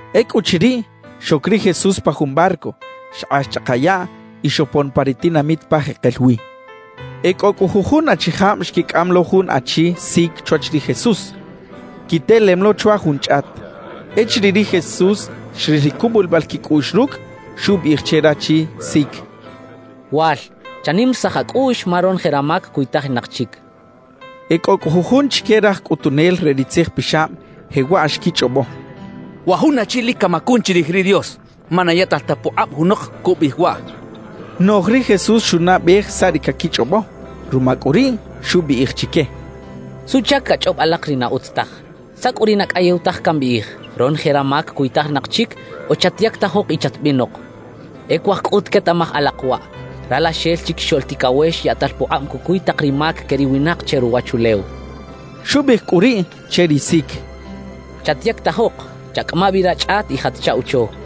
Ecꞌuchiriꞌ, xoc ri Jesús pa jun barco, xkꞌax chꞌaka yaꞌ y xopon pa ri tinamit pa jekel wi. E cꞌo cꞌu jujun achijab xquicꞌam lo jun achi sic chwach ri Jesús, quitelem lo chwa jun chꞌat. Echiriꞌ ri Jesús xril ri cubulibal quicꞌuꞌx rucꞌ, xubiꞌij che rachi sic: —Wal, chanimarisaj acꞌuꞌx, ma ronoje ramac cuytajinak chic —xchaꞌ. E cꞌo cꞌu jujun chique raj cꞌutunel re ri tzijpixab jewaꞌ xquichꞌobo: «Wa jun achi lic camacun chirij ri Dios, ma na yaꞌtal ta pukꞌab junok cubiꞌij waꞌ.» Noꞌj ri Jesús xunaꞌbej saꞌ ri caquichꞌobo; ruma cꞌu riꞌ, xubiꞌij chique: —¿Suꞌchac cachꞌob alak ri na utz taj? ¿Saꞌ cꞌu ri na cꞌayew taj cambiꞌij: “Ronoje ramac cuytajinak chic” o “Chatyactajok y chatbinok”? E cuaj cꞌut quetaꞌmaj alak waꞌ: Ralaxel Chiquixoꞌl Ticawex yaꞌtal pukꞌab cucuy tak ri mac que ri winak che ruwachulew —xchaꞌ. Xubiꞌij cꞌu riꞌ che ri sic: —Chatyactajok, chacꞌama bi rachꞌat y jat chaꞌwocho —xchaꞌ.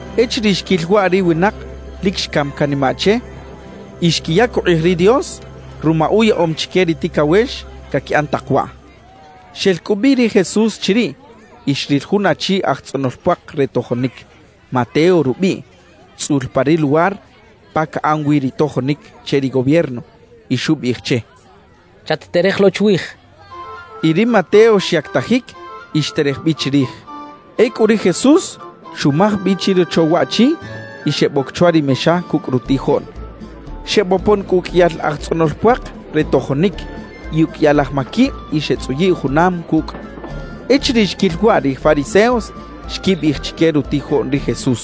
Echiriꞌ xquil waꞌ ri winak, lic xcam canimaꞌ che y xquiyac ukꞌij ri Dios ruma uyaꞌom chique ri ticawex caquiꞌan tak waꞌ. Xel cꞌu bi ri Jesús chiriꞌ y xril jun achi aj tzꞌonol puak re tojonic, Mateo rubiꞌ, tzꞌul pa ri luwar pa caꞌan wi ri tojonic che ri gobierno, y xubiꞌij che: —Chat-terej lo chwij —xchaꞌ. Y ri Mateo xyactajic y xterej bi chirij. Ecꞌu ri Jesús xumaj bi chirocho waꞌchi y xeboc chwa ri mexa cucꞌ rutijoꞌn. Xebopon cꞌu uqꞌuiyal aj tzꞌonol puak re tojonic y uqꞌuiyal aj maquib y xetzꞌuyiꞌ junam cucꞌ. Echiriꞌ xquil waꞌ ri fariseos, xquibiꞌij chique rutijoꞌn ri Jesús: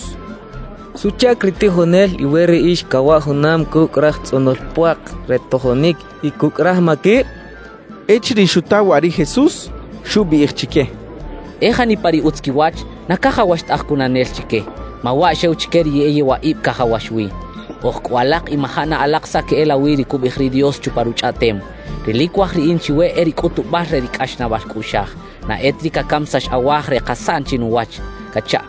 —¿Suꞌchac ri tijonel iwe riꞌix cawaꞌ junam cucꞌ raj tzꞌonol puak re tojonic y cucꞌ raj maquib? —xechaꞌ. Echiriꞌ xuta waꞌ ri Jesús, xubiꞌij chique: —E janipa ri utz quiwach, na cajawax ta aj cunanel chique; ma waꞌ xew chique ri e yewaꞌib cajawax wi. Oj cꞌu alak y maja na alak saꞌ queꞌelawi ri cubiꞌij ri Dios chupa Ruchꞌaꞌtem: Ri lic cuaj riꞌin chiwe e ri cꞌutubal re ri cꞌaxnaꞌbal cꞌuꞌxaj, na e ta ri cacamisax awaj re kasaꞌn chinuwach cachaꞌ.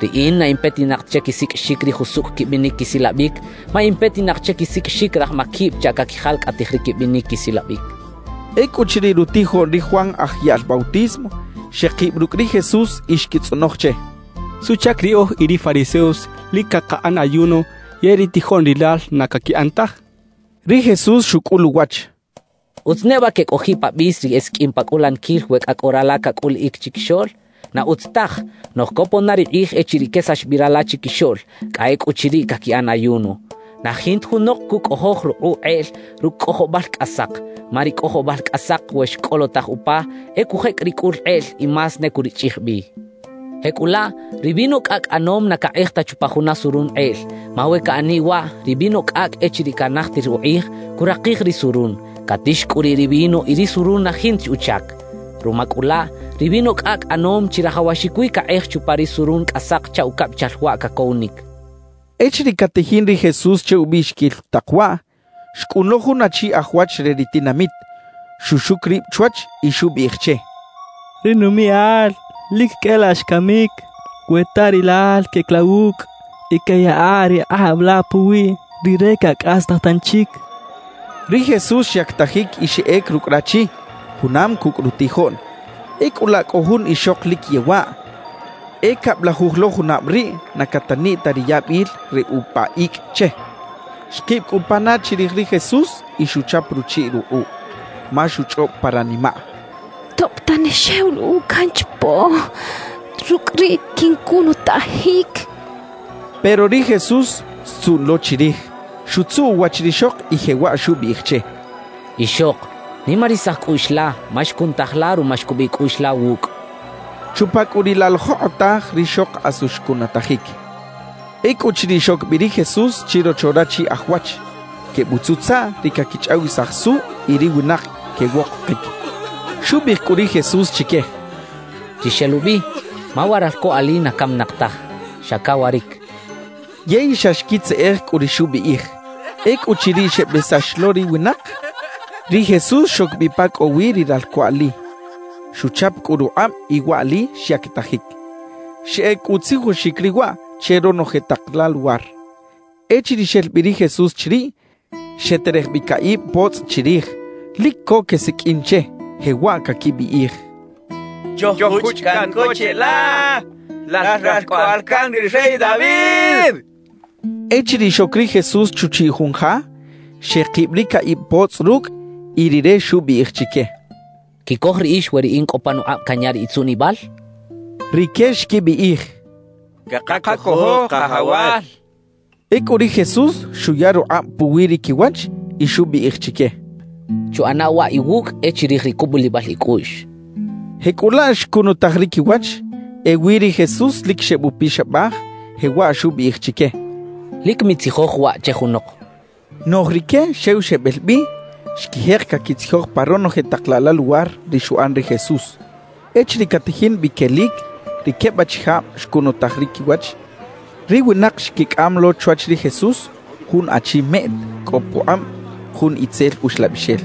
»Riꞌin na in petinak ta che quisiqꞌuixic ri jusucꞌ quibinic quisilabic, ma in petinak che quisiqꞌuixic raj maquib chaꞌ caquijalcꞌatij ri quibinic quisilabic —xchaꞌ. Ecꞌuchiriꞌ, rutijoꞌn ri Juan Aj Yaꞌl Bautismo xekib rucꞌ ri Jesús y xquitzꞌonoj che: —¿Suꞌchac riꞌoj y ri fariseos lic cakaꞌan ayuno yey ri tijoꞌn rilal na caquiꞌan taj? —xechaꞌ. Ri Jesús xucꞌul uwach: —¿Utz neba quecꞌojiꞌ pa bis ri esiqꞌuim pa cꞌulaniquil we cꞌa cꞌo rala cacꞌuliꞌic chiquixoꞌl? Na utz taj. Noꞌj copon na ri kꞌij echiriꞌ quesax bi rala chiquixoꞌl; cꞌa ecꞌuchiriꞌ caquiꞌan ayuno. Na jinta junok cucꞌojoj rukꞌuꞌ kꞌeꞌl rucꞌ cꞌojobal cꞌasak, ma ri cꞌojobal cꞌasak, we xcꞌolotaj upa, e cujecꞌ ri cꞌul kꞌeꞌl y más ne curichꞌij bi. »Jecꞌulaꞌ ri vino cꞌacꞌ ꞌanom na cakꞌej ta chupa juna surun kꞌeꞌl. Ma we caꞌaniꞌ waꞌ, ri vino cꞌacꞌ echiriꞌ canajtir ukꞌij, curakij ri surun, catix cꞌu riꞌ ri vino y ri surun na jinta chi uchac. Ruma cꞌu laꞌ, ri vino cꞌacꞌ ꞌanom chirajawaxic wi cakꞌej chupa ri surun cꞌasak chaꞌ ucabichal waꞌ cacowinic —xchaꞌ. Echiriꞌ catajin ri Jesús che ubiꞌxiquil tak waꞌ, xcꞌun lo jun achi aj wach re ri tinamit, xuxuc rib chwach y xubiꞌij che: —Ri numiꞌal lic cꞌa e laꞌ xcamic. We ta rilal queꞌec la wucꞌ y queꞌyaꞌa ri kꞌab la puwiꞌ, rire cacꞌastaj tanchic —xchaꞌ. Ri Jesús xyactajic y xeꞌec rucꞌ rachi, junam cucꞌ rutijoꞌn. Ecꞌu laꞌ, cꞌo jun ixok lic yewaꞌ, e cablajuj lo junab riꞌ na cataniꞌ ta ri yabil re upa icꞌ che. Xkib cꞌu pana chirij ri Jesús y xuchap ruchiꞌ rukꞌuꞌ. Ma xuchꞌob pa ranimaꞌ: «Tob tane xew luꞌkꞌuꞌ canchapo, rucꞌ riꞌ quincunutajic.» Pero ri Jesús xtzuꞌn lo chirij, xutzuꞌ uwach rixok y jewaꞌ xubiꞌij che: —Ixok, nimarisaj cꞌuꞌx la, ma xcunutaj la ruma xcubiꞌ cꞌuꞌx la wucꞌ —xchaꞌ. Chupa cꞌu riꞌ la jokꞌotaj rixok asu xcunutajic. Ecꞌuchiriꞌ xoc bi ri Jesús chirocho rachi aj wach, quebutzutzaꞌ ri caquichꞌawisaj suꞌ y ri winak quewokokic. Xubiꞌij cꞌu ri Jesús chique: —Chixelubi, ma wa ralco ali na caminak taj, xa cawaric —xchaꞌ. Yey xa xquitzeꞌej cꞌu ri xubiꞌij. Ecꞌuchiriꞌ xebesax lo ri winak, ri Jesús xoc bi pa cꞌo wi ri ralco ali; xuchap cꞌu rukꞌab y waꞌli xyactajic. Xeꞌec cꞌu utzijoxic riꞌ waꞌ che ronoje tak la luwar. Echiriꞌ xel bi ri Jesús chiriꞌ, xeterej bi caꞌib potzꞌ chirij, lic co quesiqꞌuin che, jewaꞌ caquibiꞌij: —¡Choj-juchꞌ caꞌn co cheꞌla, lal Ralcꞌoꞌal can ri rey David! —xechaꞌ. Echiriꞌ xoc ri Jesús chuchiꞌ jun ja, xekib ri caꞌib potzꞌ rucꞌ y Rire xubiꞌij chique: —¿Quicoj riꞌix we riꞌin cꞌo panukꞌab canya ri itzuꞌnibal? —xchaꞌ. Rique xquibiꞌij: —Cakacojo, Kajawal —xechaꞌ. Ecꞌu ri Jesús xuya rukꞌab puwi ri quiwach y xubiꞌij chique: —Chuꞌana waꞌ iwucꞌ e chirij ri cubulibal icꞌuꞌx —xchaꞌ. Jecꞌulaꞌ xcunutaj ri quiwach. Ewi ri Jesús lic xebupixabaj, jewaꞌ xubiꞌij chique: —Lic mitzijoj waꞌ che junok —xchaꞌ. Noꞌj rique xew xebel bi, xquijek caquitzijoj pa ronoje tak laꞌ la luwar ri xuꞌan ri Jesús. Echiriꞌ catajin bi quelic ri queb achijab xcunutaj ri quiwach, ri winak xquicꞌam lo chwach ri Jesús jun achi meꞌt cꞌo pukꞌab jun itzel uxlabixel.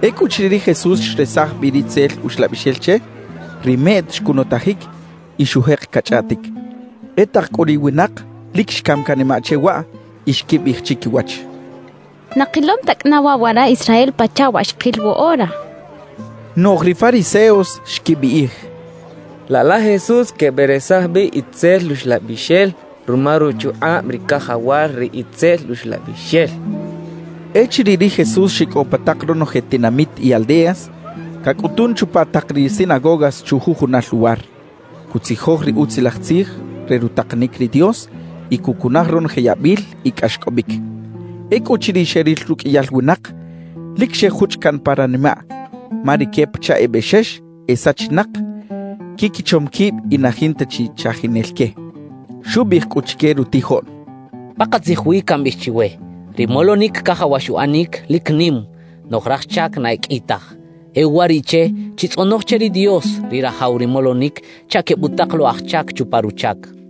Ecꞌuchiriꞌ ri Jesús xresaj bi ri itzel uxlabixel che, ri meꞌt xcunutajic y xujek cachꞌaꞌtic. E tak cꞌu ri winak lic xcam canimaꞌ che waꞌ y xquibiꞌij chiquiwach: «Na kilom ta cꞌana waꞌ wara Israel pachaꞌ wa xkil woꞌora» xechaꞌ. Noꞌj ri fariseos xquibiꞌij: «Laꞌ la Jesús queberesaj bi itzel uxlabixel ruma ruchukꞌab ri cajawal ri itzel uxlabixel» xechaꞌ. Echiriꞌ ri Jesús xicꞌow pa tak ronoje tinamit y aldeas, cacꞌutun chupa tak ri sinagogas chujujunal luwar, cutzijoj ri Utzilaj Tzij re rutakanic ri Dios y cucunaj ronoje yabil y cꞌaxcꞌobic. Ecꞌuchiriꞌ xeril ruqꞌuiyal winak, lic xejuchꞌ caꞌn pa ranimaꞌ, ma rique pachaꞌ e bexex e sachinak, quiquichom quib y na jinta chi chajinel que. Xubiꞌij cꞌu chique rutijoꞌn: «Pakatzij wi cambiꞌij chiwe: Ri molonic cajawax uꞌanic, lic nim; noꞌj raj chac na e qꞌui taj. E uwariꞌche, chitzꞌonoj che ri Dios, ri Rajaw ri molonic, chaꞌ quebutak lo aj chac chupa ruchac» xchaꞌ.